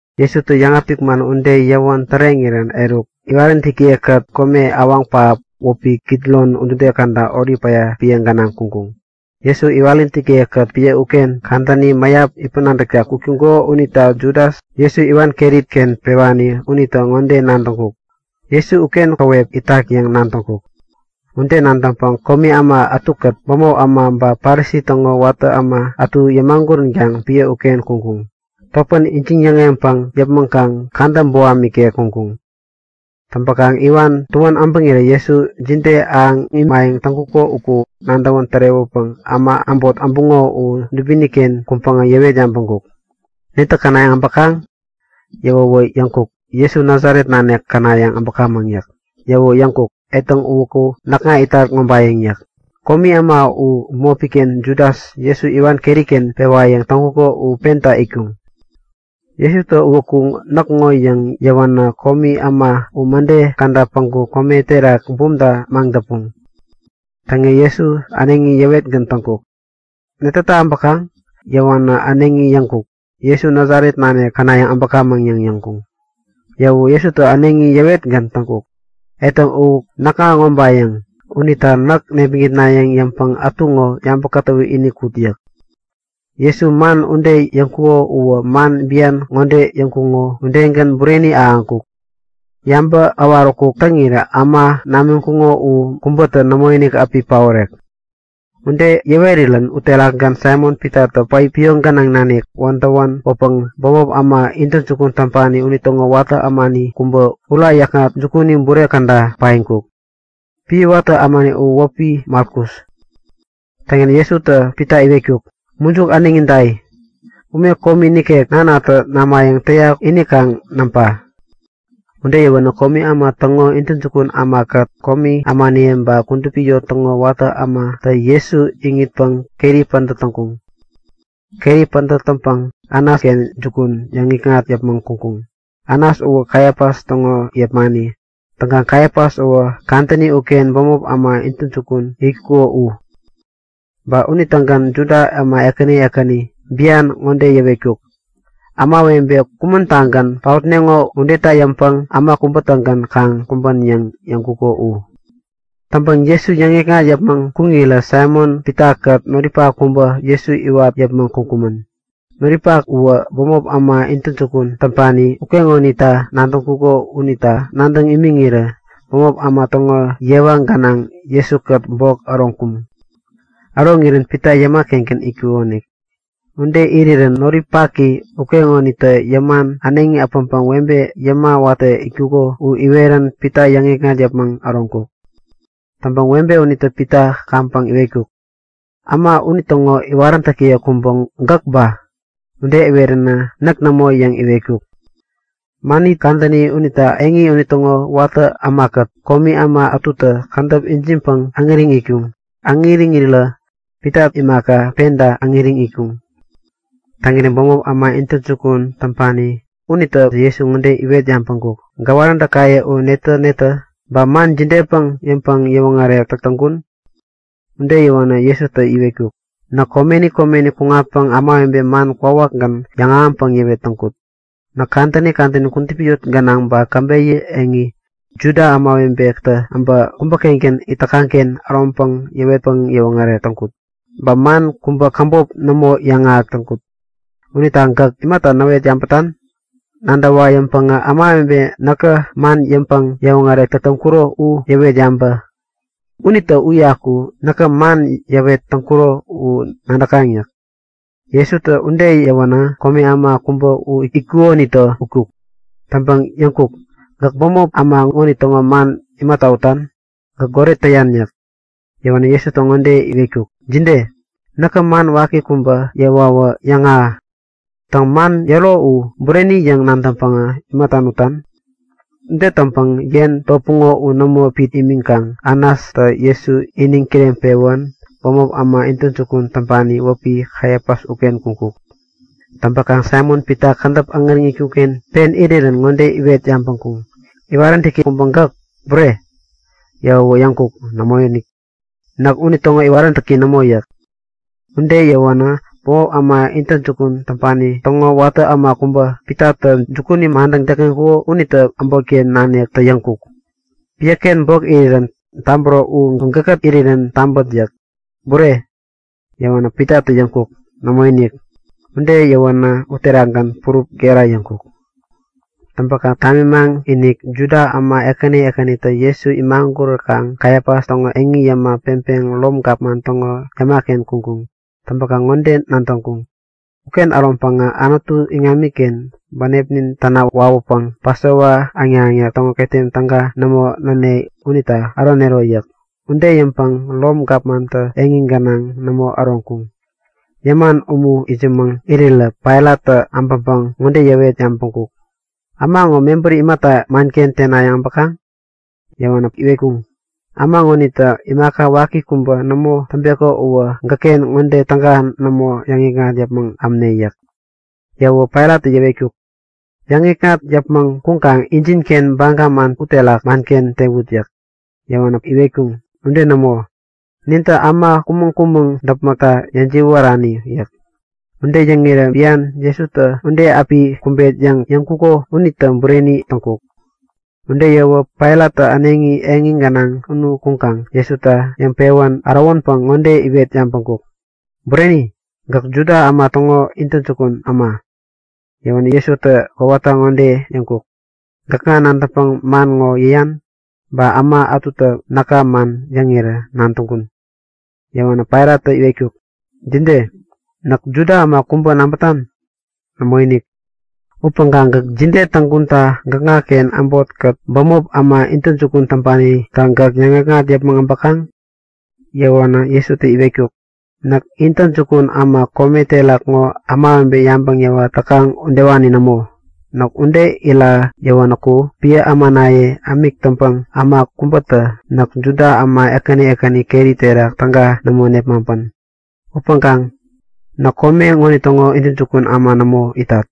Jesutä yäŋapik man ude yäwän täreŋirän eruk iwaräntäkiye-kät kome awaŋ pähap wäpi Kidron udude käda Olip päya epän gänaŋ kuŋkuŋ. Jesu iwaräntäkiye-kät epän uken kadäni mäyap itpäŋ-nadäkta kuk täŋkuŋo unita Judas, Jesu iwan keri-ken pewani unitä ŋode nadäŋkuk; Jesu uken käwep itak yäŋ nadäŋkuk. Ude nadäŋpäŋ komi äma ätukät bämop äma ba Parisi täŋo watä äma ätu yämaguränkaŋ epän uken kuŋkuŋ. Topän ijiŋ-yäŋeŋpäŋ yäpmäŋkaŋ kadä boham ikek kuŋkuŋ. Täŋpäkaŋ iwan tuän äbäŋirä Jesu jide ahäŋ imayäŋ täŋkuko uku nadäwän tärewäpäŋ äma äbot äbuŋo u dubini-ken kuŋpäŋ yäwet yabäŋkuk; Netä känayäŋ äbäkaŋ? Yäwänä yäŋkuŋ; Jesu, Nasaret nanik känayäŋ äbäkamäŋ yäk. Yäwäwä yäŋkuk; Etäŋ uwäku näkŋa itat ŋobayäŋ yäk. (Komi äma u bämopi-ken Judas, Jesu iwan keri-ken pewayäŋ täŋkuko u penta itkuŋ.) Jesutä uwäku näk ŋo yäŋ yäwänä komi äma u mäde käda päŋku kome terak bumta maŋdäpuŋ. Täŋirä Jesu äneŋi yäwetgän täŋkuk; Netäta äbäkaŋ? Yäwänä äneŋi yäŋkuŋ; Jesu, Nasaret nanik känayäŋ äbäkamäŋ yäŋ yäŋkuŋ. Yäwäwä Jesutä äneŋi yäwetgän täŋkuk; Etäŋ, u näkŋa ŋobayäŋ. Unita näk nepmäŋitnayäŋ yäŋpäŋ ätu ŋo yabä kätäwä ini kut yäk. Jesu man ude yäŋkuko uwä man bian ŋode yäŋkuko udegän bureni ahäŋkuk; Yabäŋ äwaräkuk täŋira äma namiŋkuno u kubätä nämoinik api paorek. Ude yäwerirän uterakgän Saimon-Pitatä päipi pioŋ gänaŋ nanik wädäwän kwäpäŋä bämop äma intäjukun täŋpani unitäŋo watä ämani kubä ura yäkŋat jukuni bure käda paiŋkuk. (Epän watä ämani u wäpi Malkus.) Täŋirän Jesutä Pita iwetkuk; Mujuk äneŋi dai! Ume komi nikek Nanatä namayäŋ täyak ini kaŋ näŋpa! Ude yäwänä komi äma täŋo intäjukun ämakät komi ämaniye ba kudupi eŋi täŋo watä ämatä Jesu iŋitpäŋ keri pädät täŋkuŋ. Keri pädät täŋpäŋ Anasken jukun yäŋikŋat yäpmäŋ kuŋkuŋ. Anas uwä Kaifas täŋo yepmani. Täŋkaŋ Kaifas uwä kadäni uken bämop äma intäjukun itkuko u. Ba unitägän Juda äma ekäni ekäni bian ŋode yäwetkuk; Ämawebe kumän-tagän paotneŋo udeta yäŋpäŋ äma kubä-tägän kaŋ kumbän yäŋ yäŋkuko u. Täŋpäkaŋ Jesu yäŋikŋat yäpmäŋ kuŋirä Saimon-Pitakät noripak kubä Jesu iwat yäpmäŋ kuŋkumän. Noripaki uwä bämop äma intäjukun täŋpani ukeŋonita nadäŋkuko unita nadäŋ imiŋirä bämop äma täŋo yewa gänaŋ Jesu-kät bok äroŋkuŋ. Äroŋirän Pita yäma-kengän itkukonik. Ude irirän noripaki ukeŋonitä yäman äneŋi äpäŋpäŋ webe yäma watä itkuko u iwerän Pita yäŋikŋat yäpmäŋ äroŋkuk. Täŋpäŋ webe unitä Pita kaŋpäŋ iwetkuk; Äma unitäŋo iwaräntäki kubä gäk ba? Ude iweränä Näk nämo! yäŋ iwetkuk. Mänit kadäni unita eŋi unitäŋo watä ämakät komi äma ätutä kädäp ijiŋpäŋ äŋäriŋ itkuŋ. Äŋäriŋirä Pita imaka, penta äŋäriŋ itkuŋ. Täŋirä bämop äma intäjukun täŋpani unitä Jesu ŋode iwet yabäŋkuk; Gäwaräntäkaye u netä-netä? Ba man jidepäŋ yäŋpäŋ-yäwoŋärek täk täŋkun? Ude yäwänä Jesutä iwetkuk; Näk komeni komeni kuŋatpäŋ ämawebe man kwawakgän yäŋahäŋpäŋ yäwet täŋkut. Näk kadäni kadäni kudupi yot gänaŋ ba käbeyä eŋi, Juda ämawebetä äbä kubä-kengän it täkaŋ-ken äroŋpäŋ yäwetpäŋ yäwoŋärek täŋkut. Ba man kubä käbop nämo yäŋahäk täŋkut. Unita gäk imata näwet yabätan? Nadäwa yäŋpäŋä ämawebe näkä man yäŋpäŋ-yäwoŋärek täk täŋkuro u yäwet yabä. Unitä uyaku näkä man yäwet täŋkuro u nadäkaŋ yäk. Jesutä ude yäwänä komi äma kubä u itkukonitä utkuk. Täŋpäŋ yäŋkuk; Gäk bämop äma ŋonitäŋo man imata utan? Gäk goret täyan yäk. Yäwänä Jesutä ŋode iwetkuk; Jide? Näkä man waki kubä yäwawä yäŋahä. Täŋ, man yäro u bureni yäŋ nadäŋpäŋ imata nutan? Ude täŋpäŋ yen topuŋo u nämo pit imiŋkaŋ Anastä Jesu iniŋ kireŋpewän bämop äma intäjukun täŋpani wäpi Kaifas uken kuŋkuk. Täŋpäkaŋ Saimon-Pita kädäp äŋäriŋ itkuk-ken pen irirän ŋode iwet yabäŋkuŋ; Iwaräntäki kubä gäk, bure? Yäwäwä yäŋkuk; Nämoinik! Näk unitäŋo iwaräntäki nämo yäk. Ude yäwänä bämop äma intäjukun täŋpani täŋo watä äma kubä, Pitatä jukuni madäŋ täkŋeŋkuko unitä äbotken naniktä yäŋkuk; Piäken bok irirän tabäro u gäkkät irirän tabät yäk. Bure? Yäwänä Pitatä yäŋkuk; Nämoinik! Ude yäwänä uterakgän purup gera yäŋkuk. Täŋpäkaŋ tamimaŋ-inik Juda äma ekäni ekänitä Jesu imaguräkaŋ Kaifas täŋo eŋi yäma peŋpeŋ Rom Gapman täŋo yäma-ken kuŋkuŋ. Täŋkaŋ ŋode nadäŋkuŋ; Uken äroŋpäŋä Anutu iŋamiken bänepnin täna wawäpäŋ Pasova äŋnak-äŋnak täŋo ketem täga nämo näne unita äronero yäk. Ude yäŋpäŋ Rom gapmantä eŋi gänaŋ nämo äroŋkuŋ. Yäman umu itsämäŋ irirä Pailattä äbäŋpäŋ ŋode yäwet yabäŋkuk; Äma ŋo mebäri imata manken tenayäŋ äbäkaŋ? Yäwänä iwetkuŋ; Äma ŋonitä imaka waki kubä nämo täŋpeko uwä gäkken ŋode täga nämo yäŋikŋat yäpmäŋ ämne yäk. Yäwäwä Pailattä yäwetkuk; Yäŋikŋat yäpmäŋ kuŋkaŋ injinken baga man uterak manken tewut yäk. Yäwänä iwetkuŋ; Ude nämo! Nintä äma kumäŋ-kumäŋ däpmäkta yäjiwärani yäk. (Ude yäŋirä bian Jesutä ude api kumbet yäŋ yäŋkuko unitä bureni täŋkuk.) Ude yäwäwä Pailat äneŋi eŋi gänaŋ unu kuŋkaŋ Jesuta yäŋpewän ärowänpäŋ ŋode iwet yabäŋkuk; Bureni? Gäk Juda äma täŋo intäjukun äma? Yäwänä Jesutä kowata ŋode yäŋkuk; Gäkŋa nadäŋpäŋ man ŋo yäyan, ba äma ätutä näka man yäŋirä nadäŋkun? Yäwänä Pailattä iwetkuk; Jide? Näk Juda äma kubä nabätan? Nämoinik! Upäŋkaŋ gäk jide täŋkunta gäkŋaken äbotkät bämop äma intäjukun täŋpanitä gäk yäŋgäkŋat yäpmäŋ äbäkaŋ? Yäwänä Jesutä iwetkuk; Näk intäjukun äma kome terak ŋo ämawebe yabäŋ yäwat täkaŋ udewani nämo. Näk ude ira yäwänäku epän ämanaye ämik täŋpäŋ äma kubätä näk Juda äma ekäni ekäni keri terak täga nämo nepmaŋpän. Upäŋkaŋ näk kome ŋonitäŋo intäjukun äma nämo itat.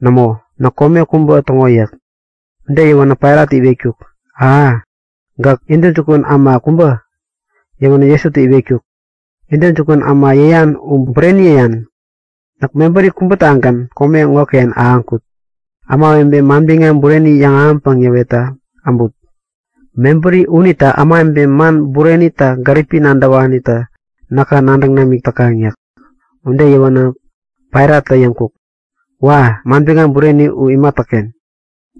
Nämo, näk kome kubä täŋo yäk. Ude yäwänä Pailattä iwetkuk; Aha, gäk intäjukun äma kubä? Yäwänä Jesutä iwetkuk; Intäjukun äma yäyan u bureni yäyan. Näk mebäri kubätagän kome ŋoken ahäŋkut; Ämawebe manbiŋam bureni yäŋahäŋpäŋ yäwetta äbut. Mebäri unita ämawebe man burenita gäripi nadäwanitä näka nadäŋ namik täkaŋ yäk. Ude yäwänä Pailattä yäŋkuk; Wa! Manbiŋam bureni u imatäken?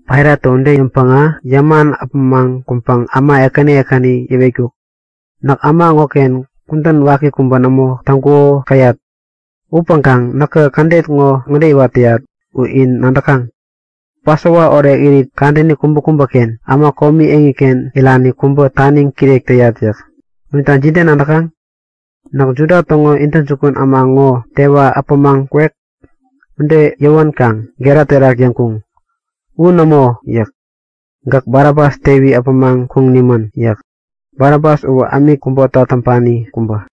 Pailattä ude yäŋpäŋä yäman äpämaŋ kuŋpäŋ äma ekäni ekäni yäwetkuk; Näk äma ŋoken kudän waki kubä nämo täŋkuko käyat. Upäŋkaŋ näkä kädet ŋode iwat täyat u in nadäkaŋ; Pasova orekirit kadäni kubäkubäken äma komi eŋiken irani kubä taniŋ kirek täyat yäk. Unita jide nadäkaŋ? Näkä Juda täŋo intäjukun äma ŋo tewa äpämaŋ kwek? Ude yäwänkaŋ gera terak yäŋkuŋ; U nämo! yäk. Gäk Barabas tewi äpämaŋ kuŋ nimän! yäk. (Barabas uwä ämik kubota täŋpani kubä.)